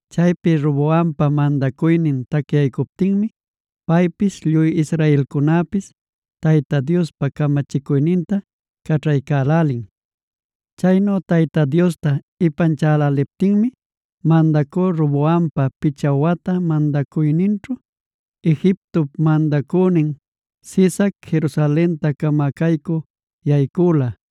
Chaypi Roboampa mandacuynin tacyaycuptinmi paypis lluy israelcunäpis Tayta Diospa camachicuyninta caćhaycälälin. Chaynu Tayta Diosta ipanchäläliptinmi mandacü Roboampa picha wata mandacuyninćhu, Egiptop mandacünin Sisac, Jerusalenta camacaycü yaycüla: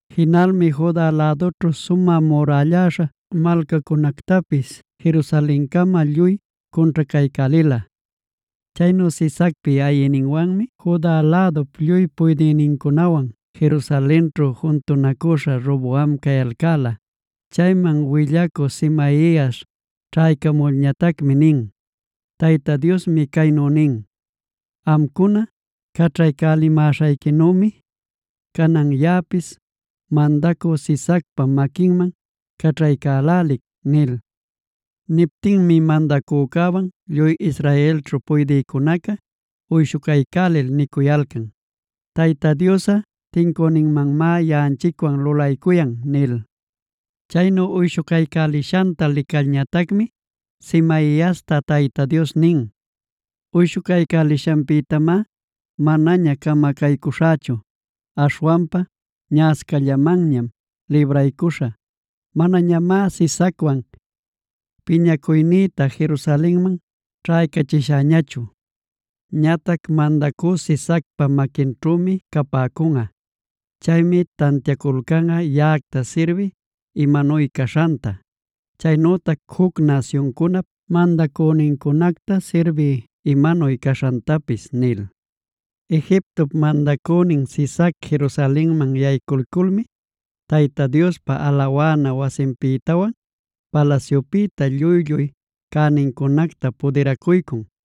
Jinalmi Juda lädućhu sumä murälläśha malcacunactapis Jerusalencama lluy cunćhacaycälila. Chaynu Sisacpi ayïninwanmi Juda lädup lluy puydïnincunawan Jerusalenćhu juntunacüśha Roboam cayalcäla. Chayman willacü Semaias ćhaycamulñatacmi nin: “Tayta Diosmi caynu nin: ‘Amcuna caćhaycälimäśhayquinümi, canan yaꞌapis mandacü Sisacpa maquinman caćhaycälälic’” nil. Niptinmi mandacücäwan lluy israelćhu puydïcunaca uyshucaycälil nicuyalcan: “¡Tayta Diosꞌa tincüninmanmá yaꞌanchicwan lulaycuyan!” nil. Chaynu uyshucaycälishanta licalñatacmi Semaiasta Tayta Dios nin: “Uyshucaycälishanpïtamá manaña camacaycuśhächu. Aśhwanpa ñaꞌascallamanñam libraycuśhä. Manañamá Sisacwan piñacuynïta Jerusalenman ćhaycachishäñachu. Ñatac mandacü Sisacpa maquinćhümi capäcunꞌa. Chaymi tantiaculcanꞌa yaꞌacta sirbiy imanuy caśhanta, chaynütac juc nasyuncunap mandacünincunacta sirbiy imanuy caśhantapis” nil. Egiptop mandacünin Sisac Jerusalenman yaycuyculmi Tayta Diospa alawana wasinpïtawan palasyupïta lluy-lluy cänincunacta pudiracuycun;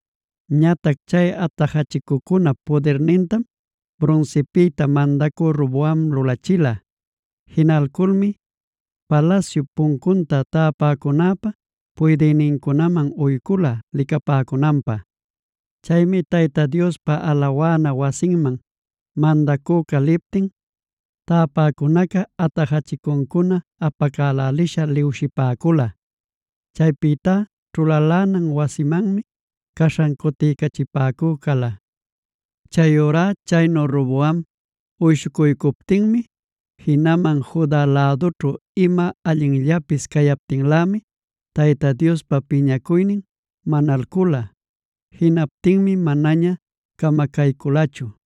Ñatac chay atajachicucunap pudirnintam brunsipïta mandacü Roboam lulachila. Jinalculmi palasyup puncunta täpäcunäpa puydïnincunaman uycula licapäcunanpä. Chaymi Tayta Diospa alawana wasinman mandacüca liptin, täpäcunaca atajachicuncuna apälälisha liwshipäcula. Chaypïtá ćhulalänan wasimanmi caśhan cutiycachipäcü cala. Chayurá chaynu Roboam uyshucuycuptinmi jinaman Juda lädućhu ima allinllapis cayaptinlämi Tayta Diospa piñacuynin manalcüla. Jinaptinmi manaña camacaycülachu.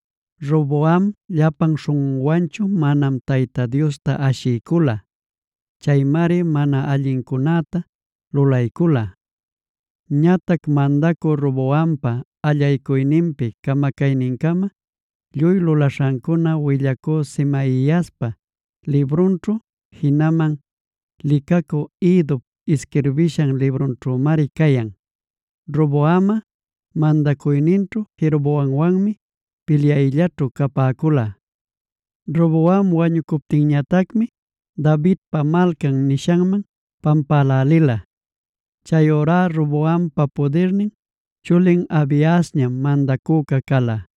Roboam llapan śhunꞌunwanchu manamá Tayta Diosta ashiycula. Chaymari mana allincunäta lulaycula. Ñatac mandacü Roboampa allaycuyninpi camacaynincama lluy lulaśhancuna willacü Semaiaspa librunćhu, jinaman licacü Iddop isquirbishan librunćhümari cayan. Roboamꞌa mandacuyninćhu Jeroboamwanmi pilyayllaćhu capäcula. Roboam wañucuptinñatacmi Davidpa Malcan nishanman pampälälila. Chayurá Roboampa pudirnin chulin Abiasñam mandacüca cala.